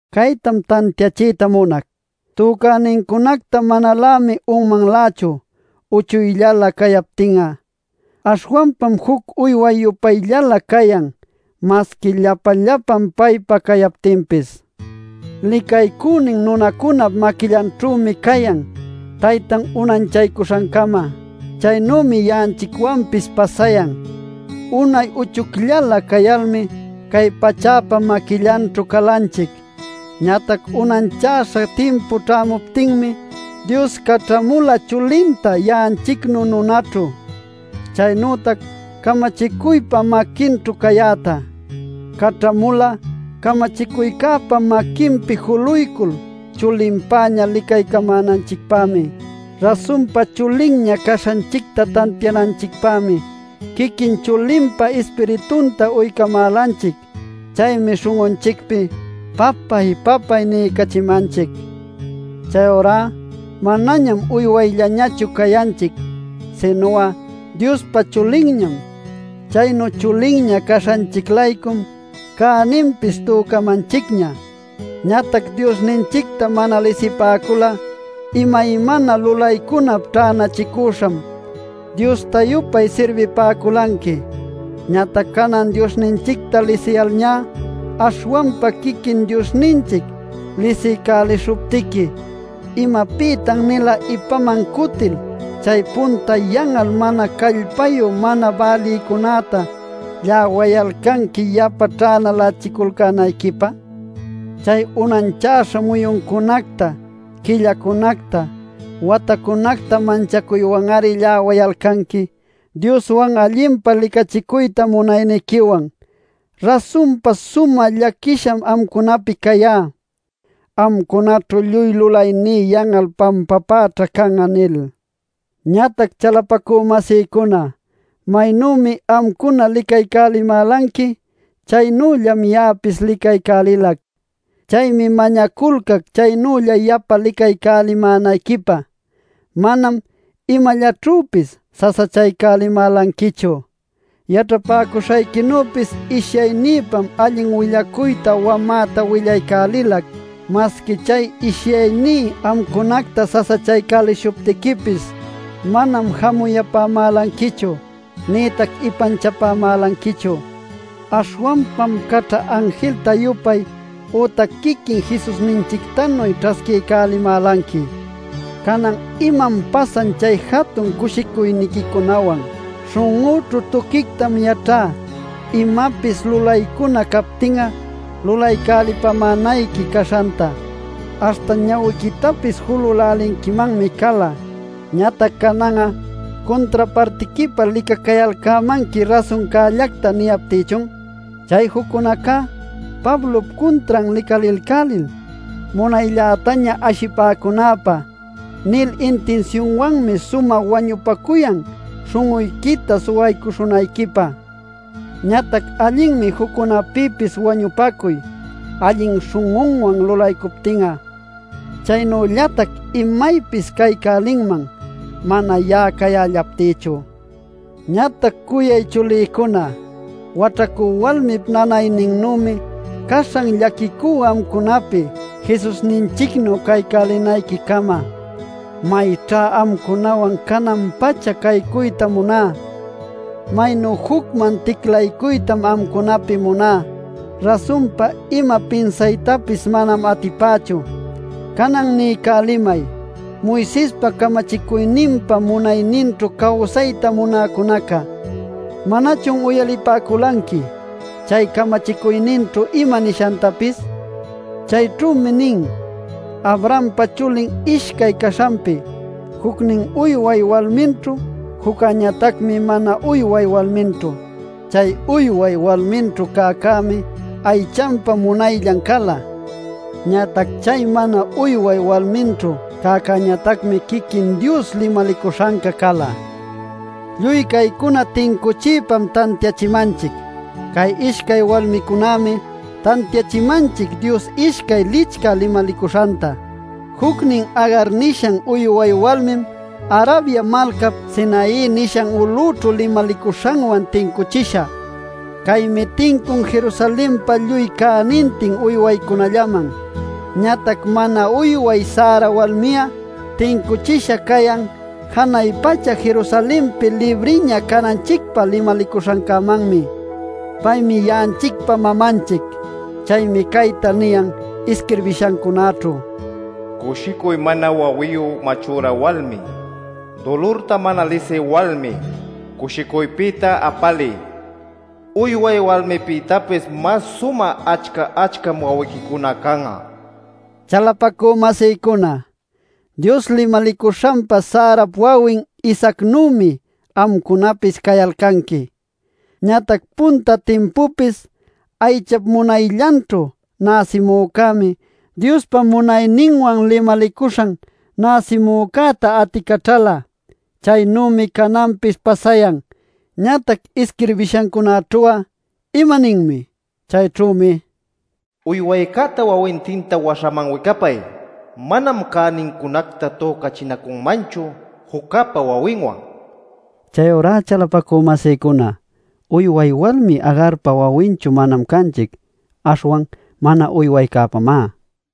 Caytam tantiachiyta munac: Tücänincunacta manalämi unmanlächu uchuyllalä cayaptin'a. Aśhwanpam juc uyway-yupayllalä cayan masqui llapa-llapan paypa cayaptinpis. Licaycünin nunacunap maquillanćhümi cayan taytan unanchaycuśhancama. Chaynümi ya'anchicwanpis pasayan: unay uchuyllalä cayalmi, cay pachäpa maquillanćhu calanchic. Ñatac unanchäśhan timpu ćhämuptinmi, Dios caćhamula chulinta ya'anchicnu nunaćhu, chaynütac camachicuypa maquinćhu cayäta. Caćhamula camachicuycäpa maquinpi juluycul, chulinpäña licaycamänanchicpämi. Rasunpa chulinña caśhanchicta tantiananchicpämi quiquin chulinpa Ispiritunta uycamälanchic. Chaymi śhun'unchicpi “¡Papáy, papáy!” niycachimanchic. Chayurá manañam uywayllanñachu cayanchic, sinu'a Diospa chulinñam. Chaynu chulinña caśhanchic-laycum cäninpis tücamanchicña. Ñatac Diosninchicta mana lisipäcul'a imaymana lulaycunap ćhänachicüśham diosta-yupay sirbipäculanqui. Ñatac canan Diosninchicta lisiyalñá - aśhwanpa quiquin Diosninchic lisiycälishuptiqui - ¿imapïtan-nila ipaman cutil chay punta yan'al mana callpayu mana bälïcunäta lläwayalcanqui yapa ćhänalächiculcänayquipä? Chay unanchäśha muyuncunacta, quillacunacta, watacunacta manchacuywan-ari lläwayalcanqui ˻Dioswan allinpa licachicuyta munayniquiwan˼. ¡Rasunpa sumä llaquisham amcunapi cayá “Amcunaćhu lluy lulayní yan'al pampapäćha can'a!” nil. Ñatac, chalapacü-masïcuna, maynümi amcuna licaycälimälanqui, chaynüllam ya'apis licaycälilac. Chaymi mañaculcac chaynülla yapa licaycälimänayquipä. Manam imallaćhüpis sasachaycälimälanquichu. Yaćhapäcuśhayquinüpis ishyaynïpam allin willacuyta wamäta willaycälilac. Masqui chay ishyayní amcunacta sasachaycälishuptiquipis manam jamuyapämälanquichu nïtac ipanchapämälanquichu. Aśhwanpam caćha anjilta-yupay, ¡ütac quiquin Jesusninchictanuy ćhasquiycapämälanqui! ¿Canan imam pasan chay jatun cushicuyniquicunawan? Śhun'üćhu tuquictam yaćhá imapis lulaycuna captin'a lulaycälipämänayqui caśhanta, aśhta ñawiquitapis julälälinquimanmi cala. Ñatac canan'a ¿cuntrapartiquipä licacayalcämanqui rasuncällacta niyaptïchun? Chay juccunacá “Pablop cuntran licalilcälil, munayllätaña ashipäcunanpä” nil intinsiunwanmi sumä wañupacuyan śhun'uyquita suwaycälishunayquipä. Ñatac allinmi juccunapïpis wañupacuy, allin śhun'uwan lulaycuptin'a. Chaynüllatac imaypis caycälinman mana ya'a cayällaptïchu. ¡Ñatac cuyay chulïcuna! ¡Waćhacü walmip nanayninnümi caśhan llaquicú amcunapi Jesusninchicnu caycälinayquicama! ¡Mayćha amcunawan canan-pacha caycuyta muná! ¡Maynu jucman ticlaycuytam amcunapi muná! ¡Rasunpa ima pinsaytapis manam atipächu! Canan niycälimay Moisespa camachicuyninpa munayninćhu cawsayta munäcunaca: ¿Manachun uyalipäculanqui chay camachicuyninćhu ima nishantapis? Chayćhümi nin Abrahampa chulin ishcay caśhanpi, jucnin uyway walminćhu, juccäñatacmi mana uyway walminćhu. Chay uyway walminćhu cäcämi aychanpa munayllan cala. Ñatac chay mana uyway walminćhu cäcäñatacmi quiquin Dios limalicuśhanca cala. Lluy caycuna tincuchiypam tantiachimanchic. Cay ishcay walmicunämi tantiaycachimanchic Dios ishcay licchä limalicuśhanta. Jucnin Agar nishan uyway walmim Arabia malcap Sinai nishan ulućhu limalicuśhanwan tincuchisha. Caymi tincun Jerusalenpa lluy cänintin uywaycunallaman. Ñatac mana uyway Sara walmi'a tincuchisha cayan janay pacha Jerusalenpi libriña cananchicpä limalicuśhancämanmi. Paymi ya'anchicpa mamanchic. Chaymi cayta niyan isquirbishancunäćhu: “Cushicuy mana wawiyu machüra walmi; dulurta mana lisï walmi cushicuypïta apaliy. Uyway walmipïtapis mas sumä achca-achcam wawiquicuna can'a” nil. Chalapacü-masïcuna, Dios limalicuśhanpa Sarap wawin Isaacnümi amcunapis cayalcanqui. Ñatac punta timpupis aychap munayllanćhu näsimücämi Diospa munayninwan limalicuśhan näsimücäta aticaćhala. Chaynümi cananpis pasayan. Ñatac isquirbishancunäćhu'a ¿imaninmi? Chayćhümi: “Uywaycäta wawintinta waśhaman wicapay; manam cänincunacta tücachinacunmanchu juccäpa wawinwan” niyan. Chayurá chalapacü-masïcuna, uyway walmi Agarpa wawinchu manam canchic, aśhwan mana uywaycäpamá.